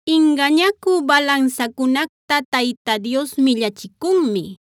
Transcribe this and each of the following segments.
Ingañacü balansacunacta Tayta Dios millachicunmi;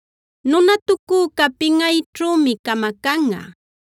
Nunatucüca pinꞌayćhümi camacanꞌa;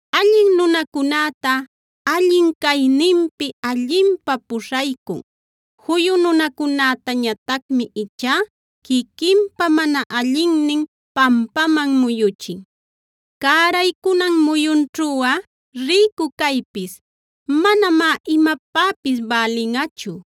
Allin nunacunäta allin cayninmi allinpä puśhaycun; juyu nunacunätañatacmi ichá quiquinpa mana allinnin pampaman muyuchin. Cäraycunan muyunćhuꞌa rïcu caypis manamá imapäpis bälinꞌachu;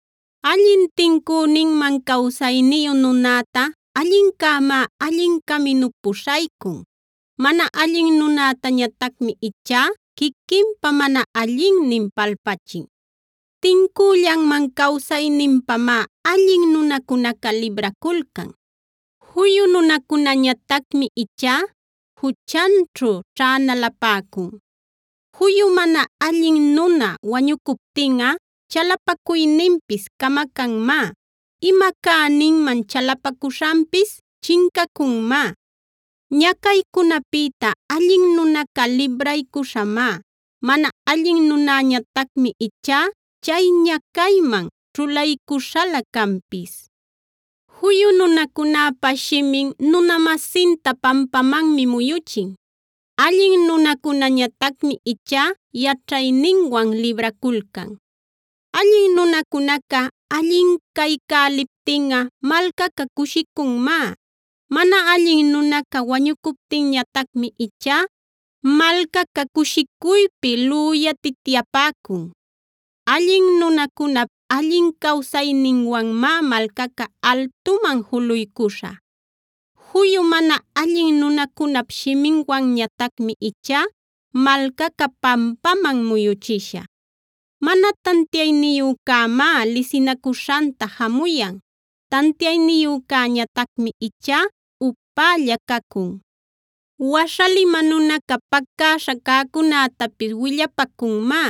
Allin tincüninman cawsayniyu nunäta allincämá allin caminup puśhaycun; mana allin nunätañatacmi ichá quiquinpa mana allinnin palpachin. Tincüllanman cawsayninpamá allin nunacunaca libraculcan; juyu nunacunäñatacmi ichá juchanćhu ćhänalapäcun. Juyu mana allin nuna wañucuptinꞌa chalapacuyninpis camacanmá; ima cäninman chalapacuśhanpis chincacunmá. Ñacaycunapïta allin nunaca libraycuśhamá; mana allin nunäñatacmi ichá chay ñacayman ćhulaycuśhalä canpis. Juyu nunacunäpa shimin nuna-masinta pampamanmi muyuchin; allin nunacunäñatacmi ichá yaćhayninwan libraculcan. Allin nunacunaca allin caycäliptinꞌa malcaca cushicunmá; mana allin nunaca wañucuptinñatacmi ichá malcaca cushicuypi lüyatityapäcun. Allin nunacunap allin cawsayninwanmá malcaca altuman juluycuśha; juyu mana allin nunacunap shiminwanñatacmi ichá malcaca pampaman muyuchisha. Mana tantiayniyücämá lisinacuśhanta jamuyan; tantiayniyücäñatacmi ichá upälla cacun. Waśhalima nunaca pacäśha cäcunätapis willapacunmá;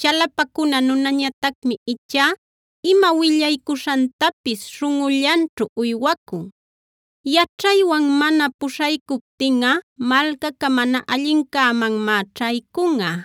chalapacuna nunäñatacmi ichá ima willaycuśhantapis śhunꞌullanćhu uywaycun. Yaćhaywan mana puśhaycuptinꞌa malcaca mana allincämanmá ćhaycunꞌa;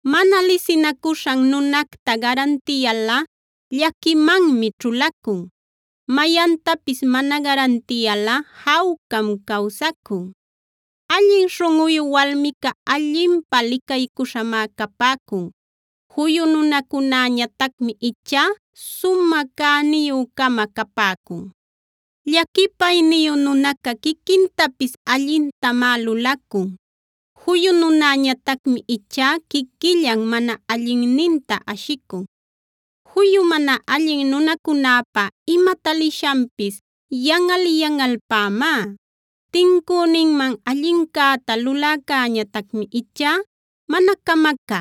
Mana lisinacuśhan nunacta garantiyalꞌa llaquimanmi ćhulacun; mayantapis mana garantiyalꞌa jawcam cawsaycun. Allin śhunꞌuyu walmica allinpä licaycuśhamá capäcun; juyu nunacunäñatacmi ichá sumä cäniyü-cama capäcun. Llaquipayniyu nunacunaca quiquintapis allintamá lulacun; juyu nunäñatacmi ichá quiquillan mana allinninta ashicun. Juyu mana allin nunacunäpa ima talishanpis yanꞌal-yanꞌalpämá; tincüninman allincäta luläcäñatacmi ichá mana camacä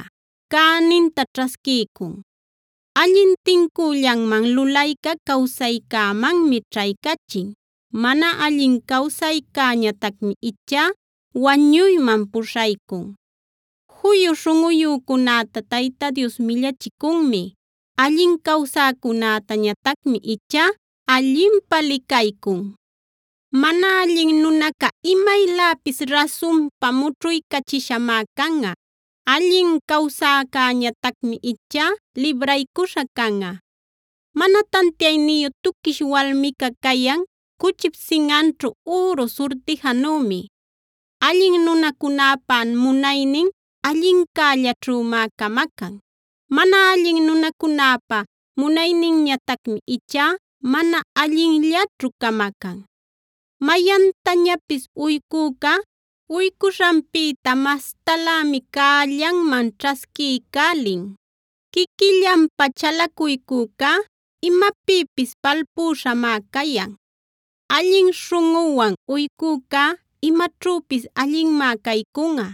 cäninta ćhasquiycun. Allin tincüllanman lulayca cawsaycämanmi ćhaycachin; mana allin cawsaycäñatacmi ichá wañuyman puśhaycun. Juyu śhunꞌuyücunäta Tayta Dios millachicunmi; allin cawsäcunätañatacmi ichá allinpä licaycun. Mana allin nunaca imayläpis rasunpa mućhuycachishamá canꞌa; allin cawsäcäñatacmi ichá libraycuśha canꞌa. Mana tantiayniyu tuquish walmica cayan cuchip sinꞌanćhu üru surtijanümi. Allin nunacunäpa munaynin allincällaćhümá camacan; mana allin nunacunäpa munayninñatacmi ichá mana allinllaćhu camacan. Mayantañapis uycüca uycuśhanpïta mastalämi cällanman ćhasquiycälin; quiquillanpä chalacuycücá imapïpis palpüśhamá cayan. Allin śhunꞌuwan uycücá imaćhüpis allinmá caycunꞌa;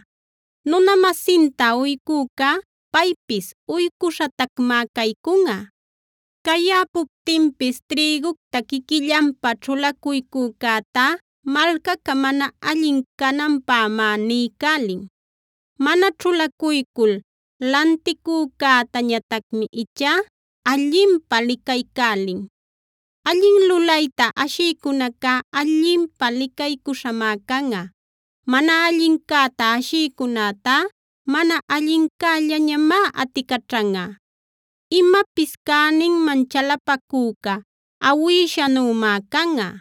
nuna-masinta uycücá paypis uycuśhatacmá caycunꞌa. Cayäpuptinpis trïgucta quiquillanpä ćhulacuycücätá, malcaca mana allin cananpämá niycälin; mana ćhulacuycul lanticücätañatacmi ichá allinpä licaycälin. Allin lulayta ashïcunacá allinpä licaycuśhamá canꞌa; mana allincäta ashïcunätá mana allincällañamá aticaćhanꞌa. Imapis cäninman chalapacücá awïshanümá canꞌa;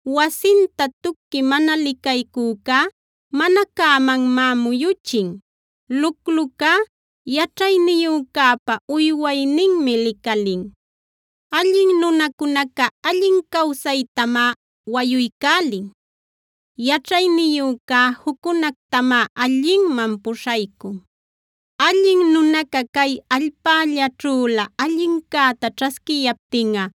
Wasinta tuquip mana licaycücá mana cämanmanmá muyuchin; luclucá yaćhayniyücäpa uywayninmi licalin. Allin nunacunaca allin cawsaytamá wayuycälin; yaćhayniyücá juccunactamá allinman puśhaycun. Allin nunaca cay allpällaćhülä allincäta ćhasquiyaptinꞌa,